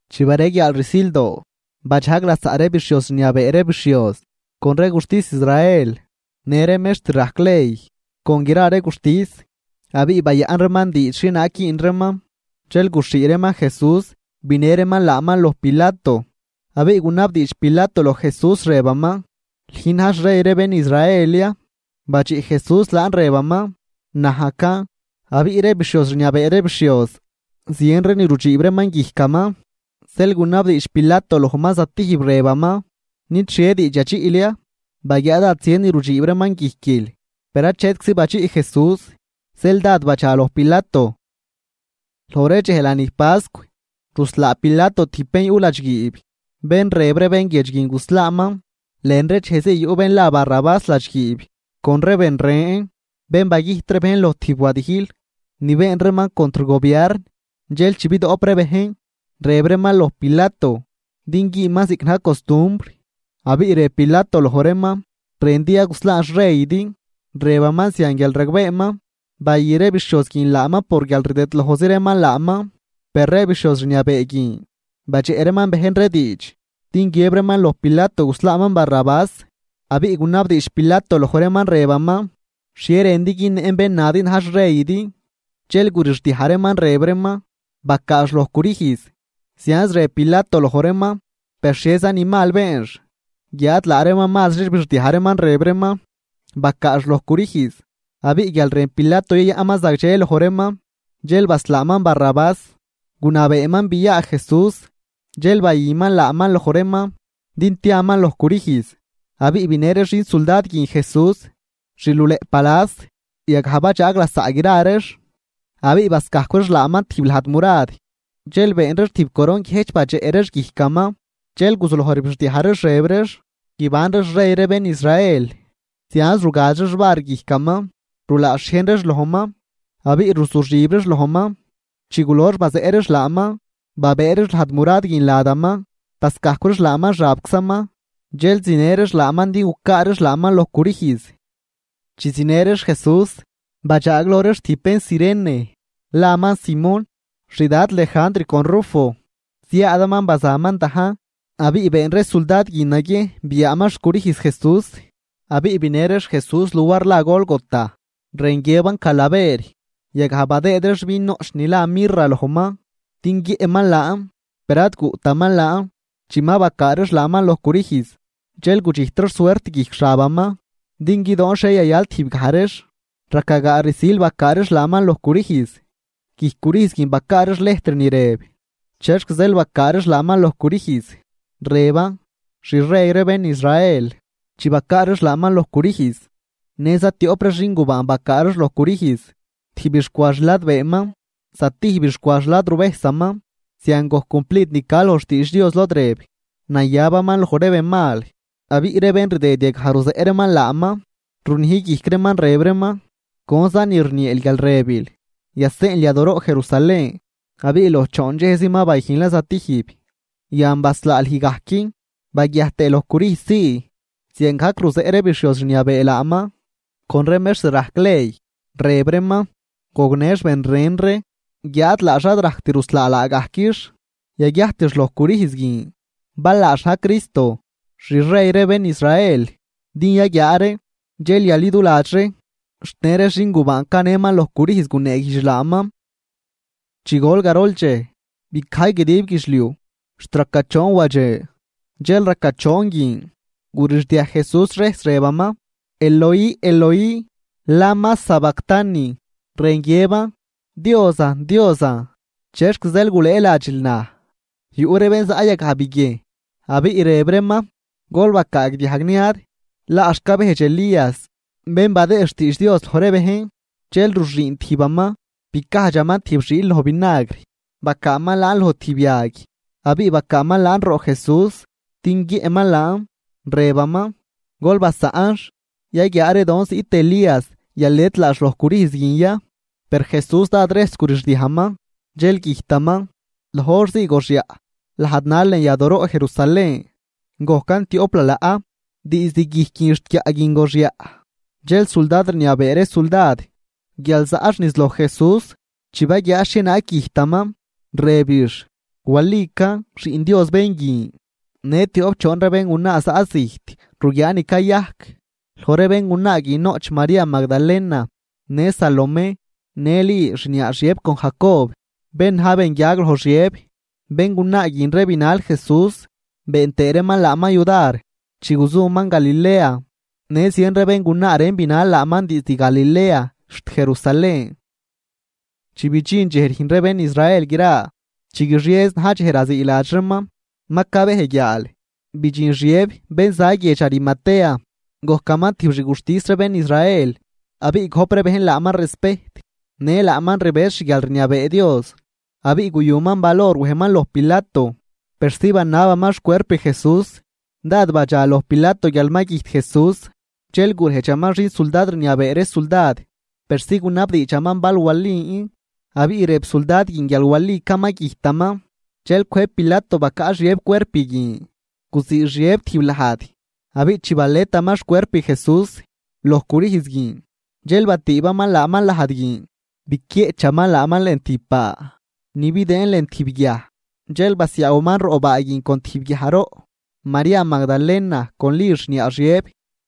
Chi bareguiaal rsildoo, badxajg lasaꞌ ree bixhioz rniabee ree bixhioz con ree guxtis Israel në ree mextr rajc ley con gra ree guxtis, abiꞌ bayaꞌn reeman diidx xhienaag güün reeman. Dxel guxhii reeman Jesús binë reeman laaman loj Pilato. Abiꞌ gunabdiidx Pilato loj Jesús rëbaman: ―¿Lüjn na̱j xrey ree bén Israel ya? Badxiꞌ Jesús laan rëbaman: ―Najcan. Abiꞌ ree bixhioz rniabee ree bixhioz zien ni rudxiib reeman guijcaman, zeel gunabdiidx Pilato lojman zatijb, rëbaman: ―¿Nid xhie diidx yadxiꞌl ya? Baguiaa dád zien ni rudxiib reeman guijquil. Per achetczi badxiꞌ Jesús, zeel dád badxa loj Pilato Loj ree dxej lanij pascw, ruslaa Pilato tijb bén yuꞌ ladxguiib, bén rëb ree bén guiedx guin guslaaman. Lën ree dxej zii yuꞌ bén la Barrabás ladxguiib con ree ben ren, bén bagüjt ree bejn loj tijb wadijl ni been reeman contr gobiarn. Dxel chi bidoꞌp ree bejn, rëb reeman loj Pilato din güünman ziꞌc na̱j costumbr, Abiꞌ rëb Pilato loj reeman: ―¿Rëndi ya guslaan xreydi? Rëbaman zian guial ragbeeman bayü ree bixhioz guin laaman por guial rdëdlojzi reeman laaman. Per ree bixhioz rniabee guin badxeꞌ reeman bejn ree diidx din guiëb reeman loj Pilato guslaaman Barrabás. Abiꞌ gunabdiidx Pilato loj reeman rëbaman: ―¿Xhie rëndi günnëꞌn bén nadi na̱j xreydi? Dxel gurixdiaj reeman rëb reeman: ―¡Bacaax loj crüjz! Zianz rëb Pilato loj reeman: ―Per ¿xhieza ni mal beenx? Guiáad laa reeman mazri rbixdiaj reeman, rëb reeman: ―¡Bacaax loj crüjz! Abiꞌ guial rën Pilato yayaꞌnman zagdxe loj reeman, zeel baslaaman Barrabás, gunabeeman a Jesús, dxel bayüman laaman loj reeman din tiaman loj crüjz. Abiꞌ binë ree xin suldad guin Jesús xluleꞌ palas, yagaj badxaag lasaꞌ gra reex. Abiꞌ bascajcw reex laaman tijb lajd murad, dxel been reex tijb coron guiëjch badxeꞌ reex guijcaman. Dxel guzuloj rbixdiaj reex rëb reex: ―¡Guibanri xrey ree bén Israel! Zianz rugaz reex var guijcaman, rulaa xhiejn reex lojman, abiꞌ ruzuxib reex lojman. Chi gulox bazeꞌ reex laaman, babëë reex lajd murad guin ladaman, bascajcw reex xabczaman, dxel zinë reex laaman din gucaa reex laaman loj crüjz. Chi zinë reex Jesús, badxaagloj reeman tijb bén Cirene, laman Simón, xdad Lejandr con Rufo, ziaadaman bazaman dajn. Abiꞌ been ree suldad guin naguiejn biaaman xcrüjz Jesús. Abiꞌ binë reex Jesús luar la Gólgota, rën guiëban Calaver. Yagaj badëëd reex vin noꞌch ni la mirra lojman din guiëꞌman laan, per ad guꞌtaman laan. Chi ma bacaa reex laaman loj crüjz, dxel gudxijt reex suert guijc xabaman din guidoon xhie yayal tijbgaj reex Raca gaa rsil bacaa reex laaman loj crüjz. Guijc crüjz guin bacaa reex lejtr ni rëb chexc zeel bacaa reex laaman loj crüjz, rëban: “Xrey ree bén Israel.” Chi bacaa reex laaman loj crüjz, në zatioꞌp ree xin gubaan bacaa reex loj crüjz, tijbix cwa xladbeeman, zatijbix cwa xladruvejsaman. Zian gojc cumplid ni ca loj xtiidx Dios, lod rëb: “Nayabaman loj ree benmal.” Abiꞌ ree bén ridëd yagaj ruzeꞌ reeman laaman runij guijc reeman, rëb reeman: ―Conza ni rnieel guial rëbil, yaseꞌnl yadooroꞌ Jerusalén abiꞌ loj choon dxejzi ma bayüjnlan zatijb, yan baslaa lüj gajc baguiajt tëë loj crüjz zii. Ziangajc ruzeꞌ ree bixhioz rniabee laaman con ree mextr rajc ley, rëb reeman: ―Gognëx ben ren ree, guiáad laax ad rajct ruslaa laagajquix. Yaguiajtix loj crüjz guin, bal laax na̱j Cristo, xrey ree bén Israel, din yaguiaa ree, dxel yaliduladx ree. Xt në ree xingubaan canëman loj crüjz guneeguijdx laaman. Chi gol garol dxej, bicajy guidib guidxliuj xt raca choon wadxe. Dxel raca choon guin gurixdiaj Jesús rejs, rëbaman: ―Eloi, Eloi, ¿lama sabactani? ―rën guiëban: Diosan, Diosan, ¿chexc zeel gulëëladxil naj? Yuꞌ ree bén zaꞌ yagaj biguiejn, abiꞌ rëb reeman: ―Gol bacaagdiajg niad. Laax cabejdx Elías bén badëë xtiidx Dios loj ree bejn. Dxel ruxüün tijbaman, bicajdxaman tijb xiil loj vinagr, bacaaman laan loj tijb yag, abiꞌ bacaaman laan roꞌ Jesús din guiëꞌman laan, rëbaman: ―Gol basaꞌnx, yaguiaa ree don ziꞌt Elías yalet laax loj crüjz guin ya. Per Jesús dád rejs gurixdiajman, dxel güjtaman. Loj hor zii goxyaꞌ lajd nal lën yadooroꞌ Jerusalén, gojcan tioꞌp lalaꞌ, diizd guijc guin xt guiaꞌ guin goxyaꞌ. Dxel suldad rniabee ree suldad guial zaꞌx niz loj Jesús. Chi baguiaax xhienaag güjtaman, rëbix: ―Walican, Xiꞌn Dios bén guin. Në tioꞌp choon ree béngunaa zaꞌ zijt ruguiaa ni cayajc. Loj ree béngunaa guin noꞌch María Magdalena, në Salomé në Li xniaa Xiëb con Jacob bén na̱j benguiag loj Xiëb. Béngunaa guin ree binal Jesús, been tëë reeman laaman yudar chi guzuman Galilea, në zien ree béngunaa ren binal laaman diizd Galilea xt Jerusalén. Chi bidxin dxej rüjn ree bén Israel gra, chi guixiezi na̱j dxej raziiladx reeman, ma cabej guiaal, bidxin Xiëb bén za guiedx Arimatea. Gojcaman tijb xguxtis ree bén Israel, abiꞌ gojp ree bejn laaman respejt, në laaman rbëz xguialrniabee Dios, abiꞌ guyuman valor wejman loj Pilato, persi banabaman xcuerp Jesús. Dád badxa loj Pilato guial ma güjt Jesús, dxel gurejdxaman xin suldad rniabee ree suldad persi gunabdiidxaman bal walin. Abiꞌ rëb suldad guin guial walican ma güjtaman, dxel cwëjb Pilato bacaꞌ Xiëb cuerp guin. Guzii Xiëb tijb lajd, abiꞌ chi baletaman xcuerp Jesús loj crüjz guin dxel batüübaman laaman lajd guin, biquieꞌchaman laaman lën tijb baa ni bidëën lën tijb guiaj, dxel basiaawaman roꞌ baa guin con tijb guiajroꞌ. María Magdalena con Li xniaa Xiëb,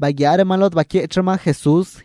baguiaa reeman lod baquieꞌch reeman Jesús.